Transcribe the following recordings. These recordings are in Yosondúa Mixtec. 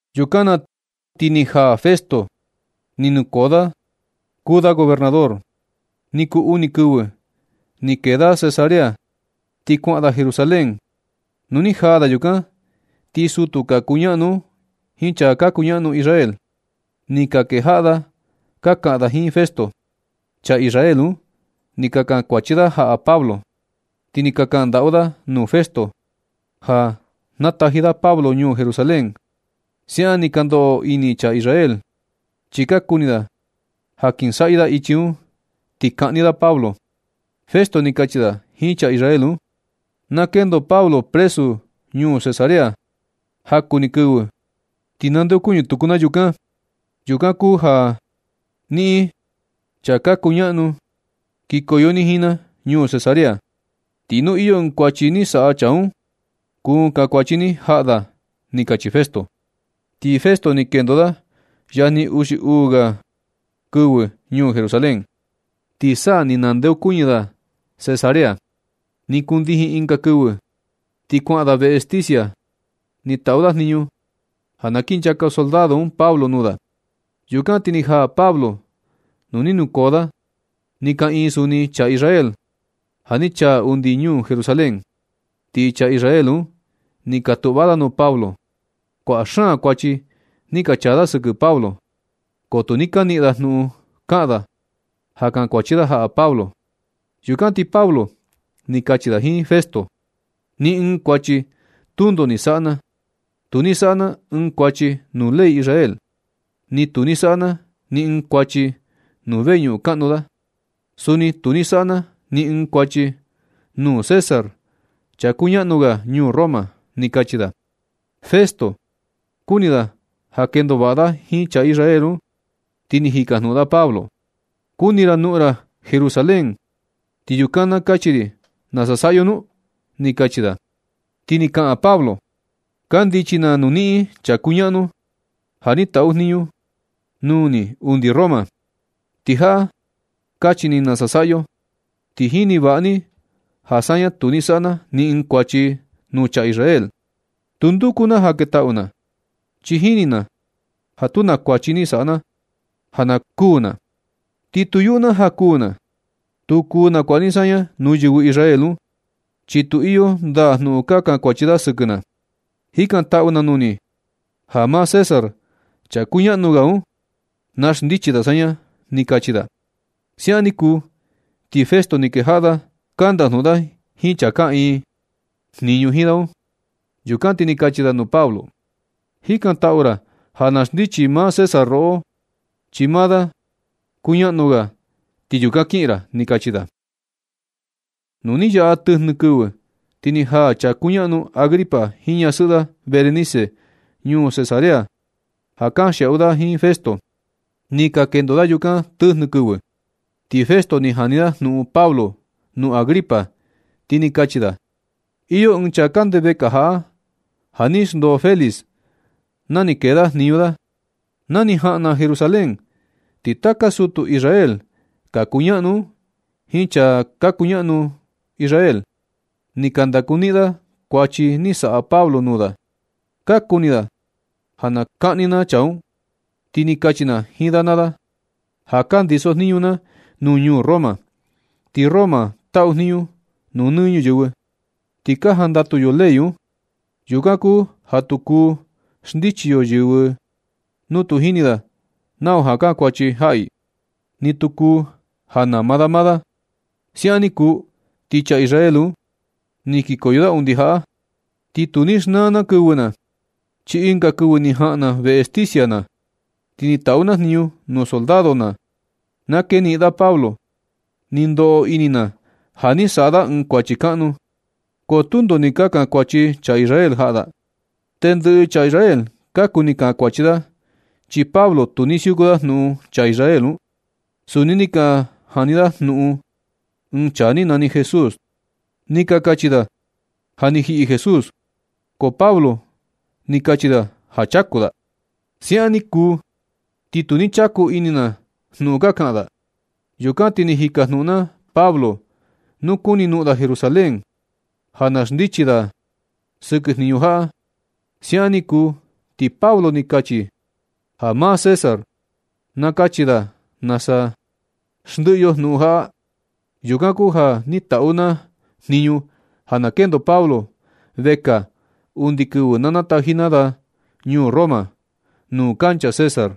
Yukan na ti ni jaa Festo, ni nukoo da kuu da gobernador. Ni kuu uni kɨvɨ, ni kee da Cesarea ti kuaꞌan da Jerusalén. Nu ni jaa da yukan, ti sutu ka kuñaꞌnu un jiin chaa ka kuñaꞌnu Israel, ni ka kejaꞌa da ka kaꞌan da jiin Festo. Chaa Israel un ni ka kankuachi da jaꞌa Pablo. Ni ka kaꞌan ndaꞌu da nuu Festo ja na nataji da Pablo ñuu Jerusalén. Siaꞌan ni ka ndoꞌo ini chaa Israel, chi ka kuni da ja kinsaꞌyɨ da ichi un, ti kaꞌni da Pablo. Festo ni kachi da jiin chaa Israel un: ―Na kendo Pablo presu ñuu Cesarea. Jaku ni kɨvɨ ti nandeokuñɨ tuku na yukan. Yukan kuu ja niꞌin chaa ka kuñaꞌnu kikoyo ni jiin na ñuu Cesarea, ti nu iyo ɨɨn kuachi ni saꞌa chaa un, kuu kankuachi ni jaꞌa da ―ni kachi Festo. Ti Festo ni kendo da yajni uxi uu ga kɨvɨ ñuu Jerusalén, ti sa ni nandeokuñɨ da Cesarea. Ni kundijin ɨnga kɨvɨ ti kuaꞌan da veꞌe sticia. Ni taꞌu da jniñu ja na kinchaka soldado un Pablo nuu da. Yukan ti ni jaa Pablo nuu ni nukoo da. Ni kaꞌiin suni chaa Israel ja ni chaa undi ñuu Jerusalén, ti chaa Israel un ni ka tuꞌva da nuu Pablo. Kuaꞌa xaan kuachi ni ka chaa da sɨkɨ Pablo, ko tu ni ka niꞌin da jnuꞌun kaꞌan da ja kankuachi jaꞌa Pablo. Yukan ti Pablo ni kachi da jiin Festo: ―Ni ɨɨn kuachi tundo ni saꞌa na. Tu ni saꞌa na ɨɨn kuachi nuu ley Israel, ni tu ni saꞌa na ni ɨɨn kuachi nuu veñuꞌun kaꞌnu da, suni tu ni saꞌa na ni ɨɨn kuachi nuu César, chaa kuñaꞌnu ga ñuu Roma ―ni kachi da. Festo kuni da ja na kendo vaꞌa da jiin chaa Israel un, ti ni jikajnuꞌun da Pablo: ―¿Kuni ra noꞌon ra Jerusalén, ti yukan na kachi ri nasa saꞌa yo nu? ―ni kachi da. Ti ni kaꞌan Pablo: ―Kandichi na nuu niꞌin chaa kuñaꞌnu, ja ni taꞌu jniñu nuu ni undi Roma, ti jaꞌa kachi ni nasa saꞌa yo, ti jini vaꞌa ni ja saña tu ni saꞌa na ni ɨɨn kuachi nuu chaa Israel. Tu nduku na ja na ketaꞌu na, chi jini na ja tu na kuachi ni saꞌa na ja na kuu na. Ti tu yuꞌu na ja kuū na. Tu kuu nakuaꞌa ni saña nuu yɨvɨ Israel un, chi tu iyo ndaa jnuꞌun ka kankuachi da sɨkɨ na. Jikantaꞌu na nuu ni ja maa César, chaa kuñaꞌnu ga un, na xndichi da saña ―ni kachi da. Siaꞌan ni kuu, ti Festo ni kejaꞌa da ka ndajnuꞌun da jiin chaa kaꞌiin jniñu jiin da un. Yukan ti ni kachi da nuu Pablo: ―Jikantaꞌu ra ja na xndichi maa César roꞌo, chi maa da kuñaꞌnu ga, ti yukan kiꞌin ra ―ni kachi da. Nu ni yaꞌa tɨjnɨ kɨvɨ, ti ni jaa chaa kuñaꞌnu Agripa jiin ñasɨꞌɨ da Berenice ñuu Cesarea ja kanxiaꞌu da jiin Festo. Ni ka kendo da yukan tɨjnɨ kɨvɨ. Ti Festo ni jani da jnuꞌun Pablo nuu Agripa, ti ni kachi da: ―Iyo ɨɨn chaa kande vekaa jaꞌa, ja ni xndoo Félix na ni kee da jniñu da. Na ni jaꞌan na Jerusalén, ti taka sutu Israel ka kuñaꞌnu un jiin chaa ka kuñaꞌnu Israel, ni ka ndakuniꞌin da kuachi ni saꞌa Pablo nuu da. Ka kuni da ja na kaꞌni na chaa un. Ti ni kachi na jiin da naa da ja ka ndisojniñu na nuu ñuu Roma, ti Roma taꞌu jniñu nuu nɨ ñuyɨvɨ, ti ka jandatu yo ley un. Yukan kuu ja tu kuu xndichi yo yɨvɨ nu tu jini da nau ja kankuachi jaꞌa i, ni tu kuu ja nama da maa da. Siaꞌan ni kuu, ti chaa Israel un ni kikoyo da undi jaꞌa. Ti tu ni xnaa na kɨvɨ na, chi ɨnga kɨvɨ ni jaꞌan na veꞌe sticia na, ti ni taꞌu na jniñu nuu soldado ja na keniꞌin da Pablo. Ni ndoꞌo ini na ja ni saꞌa da ɨɨn kuachi kaꞌnu, ko tundo ni ka kankuachi chaa Israel jaꞌa da. Tendɨꞌɨ chaa Israel ka kuni kankuachi da, chi Pablo tu ni siuku da jnuꞌun. Chaa Israel un, suni ni ka jani da jnuꞌun ɨɨn chaa ni nani Jesús. Ni ka kachi da ja ni jiꞌi Jesús, ko Pablo ni kachi da ja chaku da. Siaꞌan ni kuu, ti tu ni chaku ini na jnuꞌun ka kaꞌan da. Yukan ti ni jikajnuꞌun na Pablo nu kuni noꞌon da Jerusalén ja na xndichi na da sɨkɨ jniñu jaꞌa. Siaꞌan ni kuu ti Pablo, ni kachi da ja maa César na kachi da nasa xndiꞌi yo jnuꞌun jaꞌa. Yukan kuu ja ni taꞌu na jniñu ja na kendo Pablo vekaa undi kɨvɨ na nataji na da ñuu Roma, nuu kancha César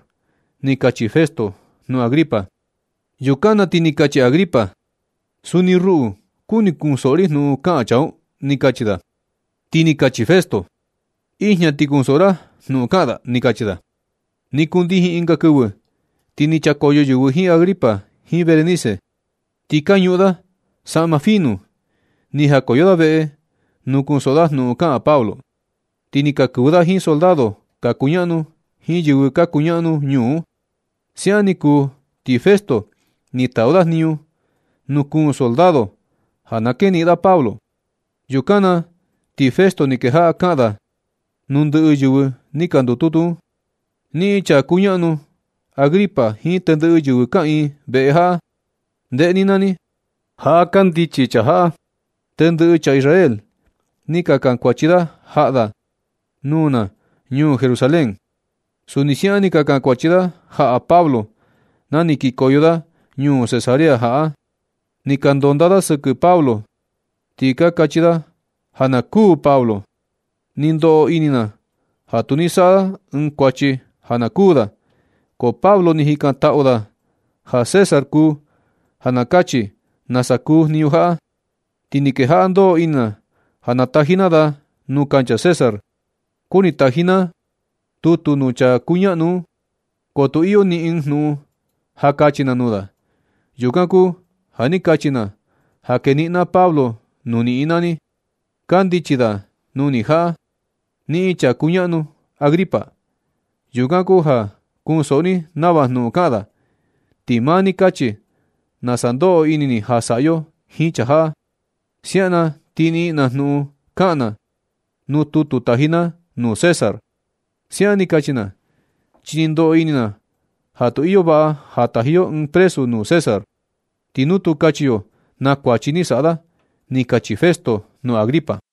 ―ni kachi Festo nuu Agripa. Yukan na ti ni kachi Agripa: ―Suni ruꞌu, kuni kunsoꞌo ri jnuꞌun kaꞌan chaa un ―ni kachi da. Ti ni kachi Festo: ―Ijña ti kunsoꞌo ni jnuꞌun kaꞌan da ―ni kachi da. Ni kundijin ɨnga kɨvɨ, ti ni chakoyo yɨvɨ jiin Agripa jiin Berenice. Ti ka ñuꞌun da saꞌma fino. Ni jakoyo da veꞌe nuu kunsoꞌo da jnuꞌun kaꞌan Pablo, ti ni ka kɨvɨ da jiin soldado ka kuñaꞌnu jiin yɨvɨ ka kuñaꞌnu ñuu un. Siaꞌan ni kuu, ti Festo ni taꞌu da jniñu nuu kuun soldado ja na keniꞌin da Pablo. Yukan na ti Festo ni kejaꞌa kaꞌan da nuu ndɨꞌɨ yɨvɨ ni ka ndututu un: ―Niꞌin, chaa kuñaꞌnu Agripa jiin tendɨꞌɨ yɨvɨ kaꞌiin veꞌe jaꞌa, ndeꞌe ni naa ni, jaꞌa kandichi chaa jaꞌa. Tendɨꞌɨ chaa Israel ni ka kankuachi da jaꞌa da nuu na ñuu Jerusalén. Suni siaꞌan ni ka kankuachi da jaꞌa Pablo na ni kikoyo da ñuu Cesarea jaꞌa. Ni ka ndondaa da sɨkɨ Pablo, ti ka kachi da ja na kuū Pablo. Ni ndoꞌo ini na ja tu ni saꞌa da ɨɨn kuachi ja na kuū da. Ko Pablo ni jikantaꞌu da ja César kuu ja na kachi nasa kuu jniñu jaꞌa. Ti ni kejaꞌa ndoꞌo ini na ja nataji na da nuu kancha César. Kuni taji na tutu nuu chaa kuñaꞌnu un, ko tu iyo ni ɨɨn jnuꞌun ja kachi na nuu da. Yukan kuu ja ni kachi na ja keniꞌin na Pablo nuu niꞌin naa ni. Kandichi da nuu ni jaꞌa, niꞌin chaa kuñaꞌnu Agripa. Yukan kuu ja kunsoꞌo ni nava jnuꞌun kaꞌan da, ti maa ni kachi ni nasa ndoꞌo ini ni ja saꞌa yo jiin chaa jaꞌa. Siaꞌan na ti niꞌin na jnuꞌun kaꞌan na nuu tutu taji na nuu César. Siaꞌan ni kachi na, chi ni ndoꞌo ini na ja tu iyo vaꞌa ja taji yo ɨɨn presu nuu César, ti nu tu kachi yo na kuachi ni saꞌa da ―ni kachi Festo nuu Agripa.